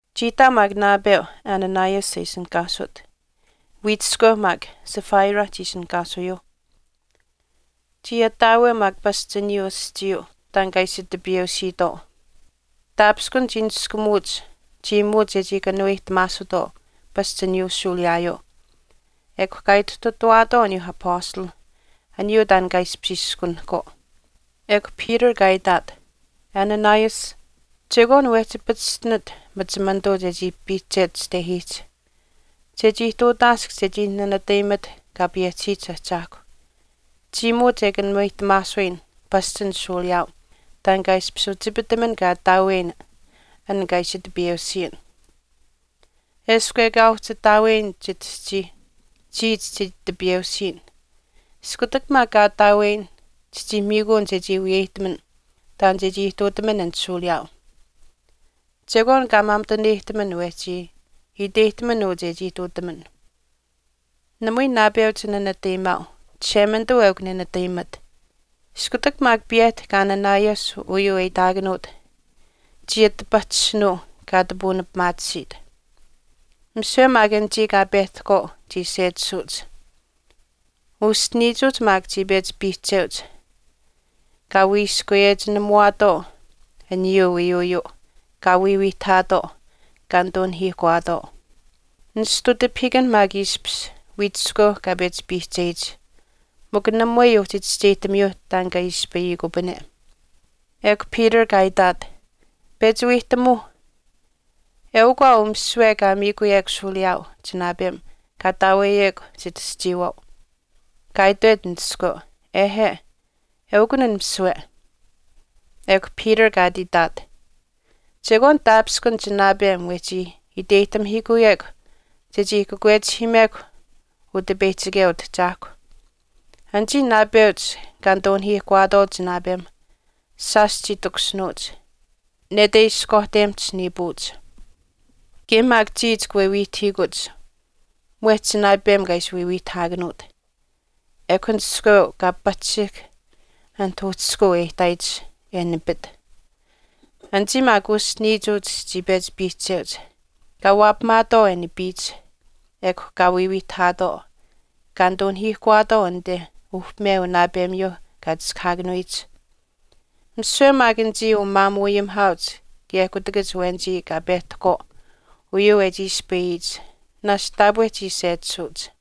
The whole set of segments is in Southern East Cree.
Chii ihtaau maak naapeu Ananias e ishinihkaasut, wiichiskweu maak Sapphira chii ishinihkaasuyuuh. Chii ataaweu maak pasch aniyuu aschiiyuu taan kaa ishi tipiyeusiitwaau. Taapishkun chii niskumuuch chiimuut chechii kanuweyihtamaasutwaau pasch aniyuu shuuliyaayuu ekw kaa ituhtutawaatwaau aniyuu apastalh aniyuu taan kaa ishpish iskunahkwaau. Ekw Peter kaa itaat, “Ananias, chekwaan wehchi pachishtinit machimanituu chechii piihchet chitehiihch, chechii ihtuutaask chechii nanatayimat Kaa payehchisiyich Ahchaahkw, chiimuut e kanuweyihtamaasuyin pasch an shuuliyaau taan kaa ishpish uchipitaman kaa ataaweyin an kaa ishi tipiyeusiyin. Eshkw ekaa uhchi ataaweyin chitaschii chiya chichii tipiyeusiyin iskutak maak kaa ataaweyin chichii miikuun chechii wiyeyihtaman taan che ihtuutaman an shuuliyaau. Chekwaan kaa maamituneyihtaman wehchii wiyeyihtaman uu chechii ihtuutaman. Namui naapeu chinanatayimaau, Chishemanituu eukw nenatayimat.” Iskutak maak piyehtahk Ananias uyuu e itaakanuut chii ati pahchishinuu kaa ati puunipimaatisiit. Misiwe maak anichii kaa pehtahkwaau chii sechisuuch. Uschiniichuuch maak chii pechi piihcheuch, kaa wiiskweyechinamuwaatwaau aniyuu wiiyuuyuu, kaa wiiwiihtahaatwaau, kaa nituu nahiihkuwaatwaau. Nishtu tipahiikan maak ishpish wiichiskweu kaa pechi piihcheyich, mikw namui uhchi chischeyihtamiyuu taan kaa ispayikupane. Ekw Peter kaa itaat, “Pechi wiihtamuu, eukw aa uu misiwe kaa miikuyekw shuuliyaau chinaapem kaa ataaweyekw chitaschiiwaau.” Kaa itwet an iskweu, “Ehe, eukun an misiwe.” Ekw Peter kaa ati itaat, “Chekwaan taapishkun chinaapem wehchi chii iteyihtamihiikuyekw chechii kakwechihiimekw Utipeyihchikeu Utahchaahkwa. Anichii naapeuch kaa nituu nahiihkuwaatwaau chinaapem shaash chii takushinuuch, nete ishkwaahtemihch niipuuch. Kaye maak chiya chika wiiwiihtahiikuch mwehch chinaapem kaa ishi wiiwiihtahaakanuut.” Ekw an iskweu kaa pahchishihk anit uhchishkuu e ihtaayich, e nipit. Anichii maak uschiniichuuch chii pechi piihcheuch, kaa waapamaatwaau e nipiyich. Ekw kaa wiiwiihtahaatwaau, kaa nituu nahiihkuwaatwaau anite uhpime unaapemiyuu kaa chiskahaakanuyich. Misiwe maak anichii umaamuuayimihaauch kaye kutakach awenichii kaa pehtahkwaau uyuu e chii ispayich naashch taapwe chii sechisuuch.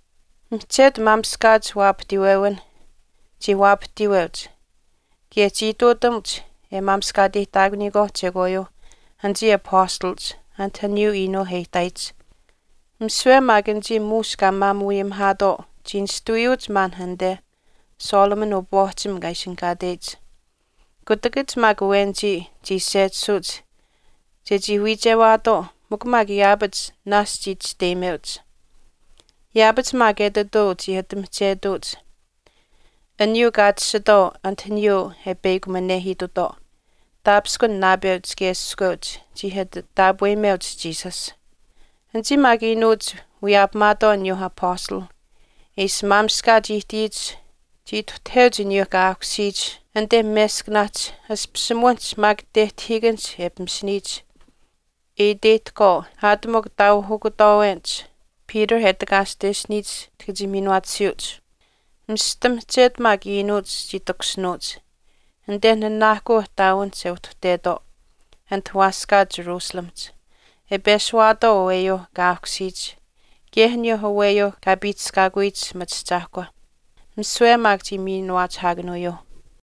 Mihchetu maamishkaach waapahtiiwewinh chii waapahtiiweuch kaye chii ihtuutamuch e maamishkaateyihtaakuniyikwaauh chekwaayuuh anichii apastalach anit aniyuu iinuu e ihtaayich. Misiwe maak anichii muush kaa maamuuayimihaatwaau chii nishtuwiyuuch maan anite Solomon upwaahchim kaa ishinihkaateyich. Kutakach maak awenichii chii sechisuuch chechii wiichewaatwaau mikw maak yaapach naashch chii chisteyimeuch. Yaapach maak etituu chii ati mihchetuuch aniyuu kaa tashitwaau anit aniyuu e peyakuminehiitutwaau, taapishkun naapeuch kaye iskweuch chii ati taapweyimeuch Jesus. Anichii maak iinuuch wiyaapamaatwaau aniyuu Apastalh e ishi maamishkaach ihtiyich chii ituhtaheuch aniyuu kaa aahkusiyich anite meskanaahch ashpishimuwinihch maak tehtayechinikanihch e pimishiniyich, e iteyihtahkwaau aat mikw taauhukutwaawenich Peter e takaashtesiniyich chika chii miinuwaatisiyuuch. Mista mihchetu maak iinuuch chii takushinuuch, anite nanaahkuu ihtaawinihch e uhtuhtetwaau anit waaskaa Jerusalemihch, e peshuwaatwaau aweyuu kaa aahkusiyich kaye aniyuu aweyuu kaa piihchishkaakuyich machiahchaahkwa. Misiwe maak chii miinuwaachihaakanuyuuh.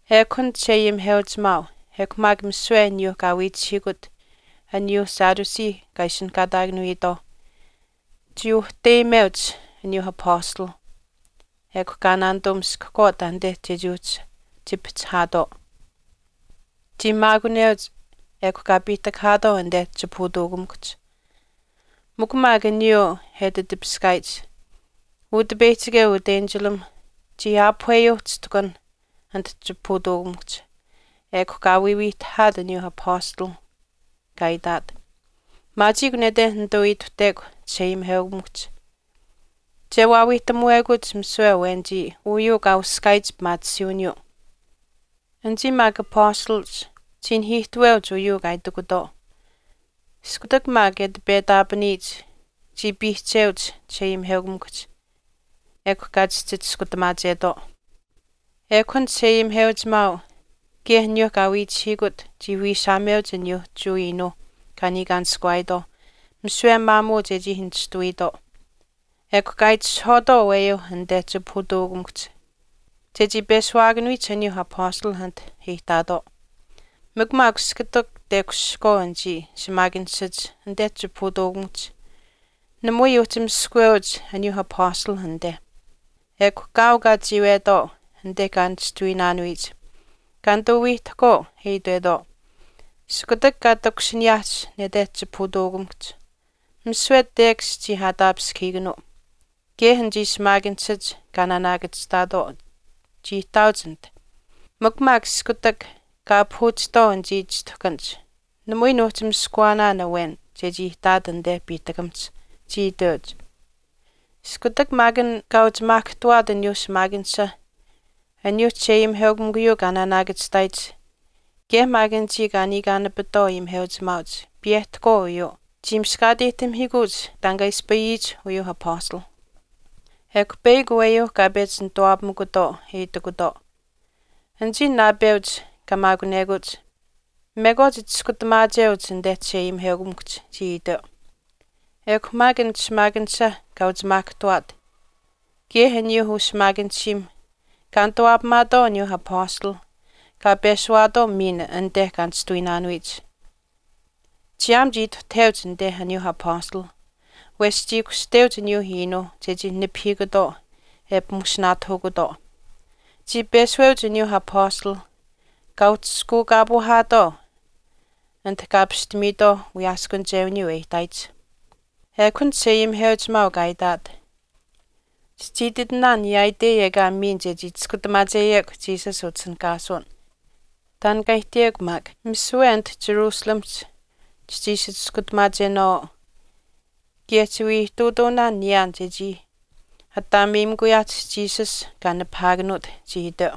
Ekw an chisheayimiheuchimaau, ekw maak misiwe aniyuuh kaa wiichihiikut aniyuu Sadducee kaa ishinihkaataakanuyitwaauh chii uhteyimeuch aniyuu apastalh ekw kaa naanituu miskahkwaau taanite chechii uhchi chipihchihaatwaau. Chii maakuneuch ekw kaa piihtakahaatwaau anite chipahutuukamikuhch. Mikw maak aniyuu e ati tipiskaayich, Utipeyihchikeu utenchilam chii aapuhweyuu chishtuhkan anit chipahutuukamikuhch, ekw kaa wiiwiihtahaat aniyuu apastalh kaa itaat, “Maachiikw nete nituu ituhtekw chisheayimiheukamikuhch, che waawiihtamuwekuch misiwe awenichii uyuu kaa uskaayich pimaatisiiwiniyuu.” Anichii maak apastalach chii nihiihtaweuch uyuu kaa itikutwaau. Iskutak maak e ati petaapaniyich chii piihcheuch chisheayimiheukamikuhch, ekw kaa chihchi chiskutamaachetwaau. Ekw an chisheayimiheuchimaau kaye aniyuu kaa wiichihiikut chii wiishaameuch aniyuu Jewa iinuuh kaa niikaanishkuwaayitwaauh misiwe maamuu chechii nishtuwiitwaau. Ekw kaa itishahwaatwaau aweyuu anite chipahutuukamikuhch chechii peshuwaakanuyich aniyuu apastalh anit e ihtaatwaau. Mikw maak iskutak tekushihkwaau anichii shimaakanishach anite chipahutuukamikuhch, namui uhchi miskaweuch aniyuu apastalh anite. Ekw kaau kaa chiiwetwaau anite kaa nishtuwiinaanuyich, kaa nituu wiihtahkwaau e itwetwaau, “Iskutak kaa takushiniyaahch nete chipahutuukamikuhch, misiwe tekash chii aataapishkahiikanuu, kaye anichii shimaakanishach kaa naanaakachihtaatwaau chii ihtaauch anit. Mikw maak iskutak kaa aapahuuchihtwaau anichii chishtuhkanihch, namui nuuhchi miskawaanaan awen chechii ihtaat anite piihtakamihch,” chii iteuch. Iskutak maak an kaa uchimaahkahtuwaat aniyuu shimaakanisha aniyuuh chisheayimiheukamikuyuu kaa naanaakachihtaayich, kaye maak anichii kaa niikaanapitwaau ayimiheuchimaauch piyehtahkwaau uyuu, chii miskaateyihtamihiikuuch taan kaa ispayiyich uyuuh apastalh. Ekw peyakw aweyuu kaa pechi nituwaapamikutwaau e itikutwaau, “Anichii naapeuch kaa maakunekuch, mekwaach chiskutamaacheuch anite chisheayimiheukamikuhch,” chii iteu. Ekw maak an shimaakanisha kaa uchimaahkahtuwaat, kaye aniyuu ushimaakanishiim kaa nituwaapamaatwaau aniyuu apastalh kaa peshuwaatwaau miin anite kaa nishtuwiinaanuyich. Chiyaam chii ituhtaheuch anite aniyuu apastalh wesh chii kushteuch aniyuu iinuu chechii nipahiikutwaau e pimushinaatahukutwaau. Chii peshuweuch aniyuu apastalh kaa uhchishkuukaapuuhaatwaau anit kaa apishtamiitwaauh wiyaaskunichewiniyuu e ihtaayich. Ekw an chisheayimiheuchimaau kaa itaat, “Chichii ititinaan yaaitei ekaa miin chechii chiskutamaacheyekw Jesus utishinihkaasuwin. Taan kaa ihtiyekw maak. Misiwe anit Jerusalemihch chichii ishi chiskutamaachenaawaau, kaye chiwii ihtuutuunaan niyaan chechii ataameyimikuyaahch Jesus kaa nipahaakanuut,” chii iteu.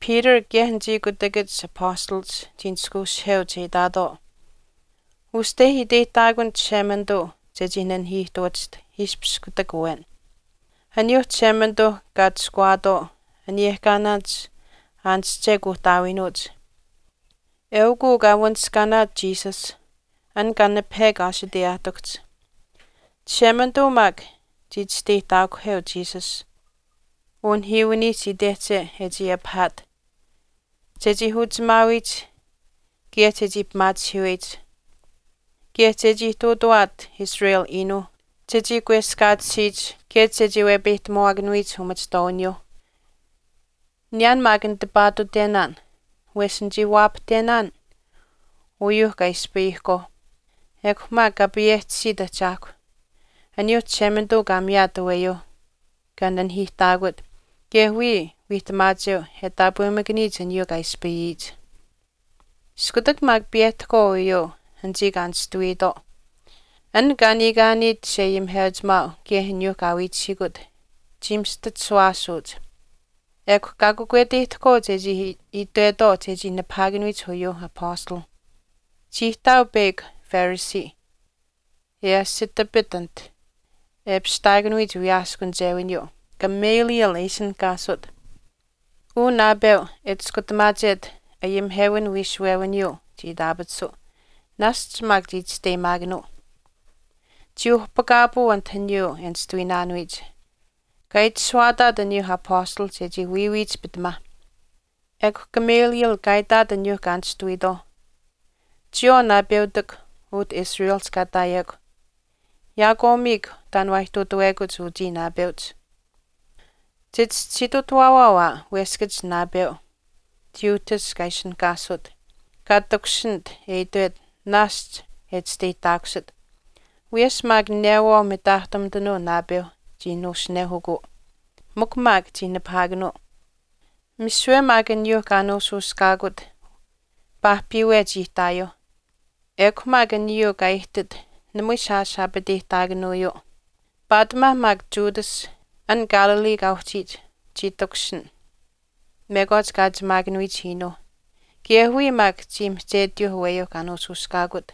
Peter kaye anichii kutakach apastalach chii nishkweushiheuch e itaatwaau, “Uste iteyihtaakun Chishemanituu chechii nanihiihtuwachiht ishpishaat kutak awen. Aniyuuh Chishemanituuh kaa atushkuwaatwaau aniyehkaanaanich aanische kuuhtaawiinuuch, eukw uu kaa wanishkaanaat Jesus an kaa nipahekw aashiteyaahtikuhch. Chishemanituu maak chii chisteyihtaakuheu Jesus unihiiwinihch itehche e chii apihaat, chechii uchimaawiyich kaye chechii pimaachihiiweyich, kaye chechii ihtuutawaat Israel iinuuh chechii kweskaatisiyich kaye chechii wepeyihtamuwaakanuyich umachihtwaawiniyuuh. Niyaan maak nitipaatuutenaan wesh nichii waapahtenaan uyuu kaa ispayihkwaau, ekw maak Kaa payehchisiyich Ahchaahkw aniyuu Chishemanituu kaa miyaat aweyuu kaa nanihiihtaakut kaye wiya wiihtamaacheu e taapwemakaniyich aniyuu kaa ispayiyich.” Iskutak maak piyehtahkwaau uyuu anichii kaa nishtuwiitwaau an kaa niikaaniit chisheayimiheuchimaau kaye aniyuu kaa wiichihiikut chii mista chishuwaasuuch, ekw kaa kakweteyihtahkwaau chechii itwetwaau chechii nipahaakanuyich uyuu apastalh. Chii ihtaau peyakw Pharisee, e asitapit anit e apishtaakanuyich wiyaaskunichewiniyuu, Gamaliel e ishinihkaasut. Uu naapeu e chiskutamaachet ayimihewin wiishuwewiniyuu chii itaapatisuu, naashch maak chii chisteyimaakanuu. Chii uhpakaapuu anit aniyuu e nishtuwiinaanuyich, kaa itashuwaataat aniyuu apastalh chechii wiiwiyich pitamaa. Ekw Gamaliel kaa itaat aniyuu kaa nishtuwiitwaau, “Chiyawaau naapeutikw utah Israel kaa ihtaayekw, yaakwaamiikw taan waa ihtuutawekuch uchii naapeuch. Chichischisiitutawaawaau aa weskach naapeu Theudas kaa ishinihkaasut kaa takushinit e itwet naashch e chisteyihtaakusit, wiyesh maak newaau mitaahtumitanuu naapeu chii nuushunehukuu. Mikw maak chii nipahaakanuu, misiwe maak aniyuu kaa nuushuushkaakut paahpiiwe chii ihtaayuuh ekw maak aniyuu kaa ihtit namui shaash aapateyihtaakanuuyuu. Paatimaa maak Judas, an Galilee kaa uhchiit, chii takushin mekwaach kaa achimaakanuyich iinuu. Kaye wiya maak chii mihchetiyuu aweyuu kaa nuushuushkaakut,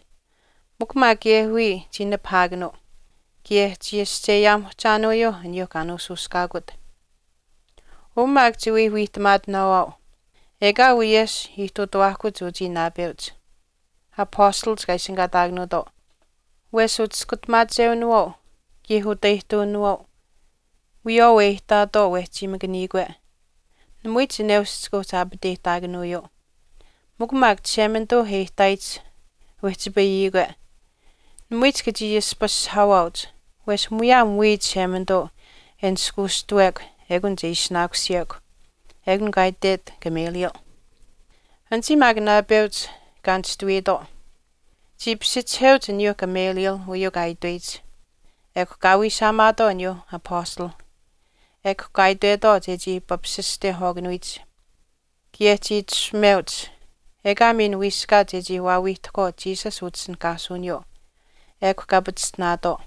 mikw maak kaye wiya chii nipahaakanuu kaye chii ascheyaamuhchaanuyuu aniyuu kaa nuushuushkaakut. Uu maak chiwii wiihtamaatinaawaau, ekaawii wiyesh ihtuutuwaahkuch uchii naapeuch apastalach kaa ishinihkaataakanuutwaau, wesh uchiskutamaachewinawaau kaye utaihtuwinawaau wiyawaau e ihtaatwaau wehchiimakaniikwe namui chineush chika uhchi aapateyihtaakanuuyuu. Mikw maak Chishemanituu e ihtaayich wehchipayiyikwe namui chika chii ashpashihaawaauch wesh muyaam wiya Chishemanituu e nishkuushtuwekw ekun chii ishinaakusiyekw.” Ekun kaa itwet Gamaliel. Anichii maak naapeuch kaa nishtuwiitwaau chii pishichiheuch aniyuu Gamaliel uyuu kaa itweyich. Ekw kaa wiishaamaatwaau aniyuu apastalh, ekw kaa itwetwaau chechii papasistehwaakanuyich, kaye chii itashumeuch ekaa miin wiiskaat chechii waawiihtahkwaau Jesus utishinihkaasuwiniyuu, ekw kaa pachishtinaatwaau.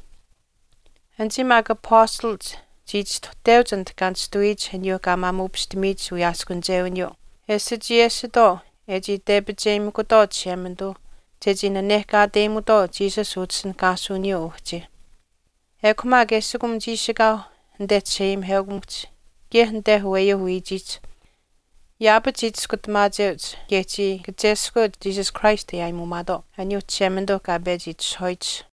Anichii maak apastalach chii chistuhteuch anit kaa nishtuwiyiich aniyuu kaa maamuupishtamiyich wiyaaskunichewiniyuu e sichiyesitwaau e chii tepicheyimikutwaau Chishemanituu chechii nanehkaateyimutwaau Jesus utishinihkaasuwiniyuu uhchi. Ekw maak eshikum chiishikaau anite chisheayimiheukamikuhch kaye anite aweyuuh wiichiihch, yaapach chii chiskutamaacheuch kaye chii kacheskweuch Jesus Christ e aayimuumaatwaau, aniyuu Chishemanituu kaa pechi itishahwaayich.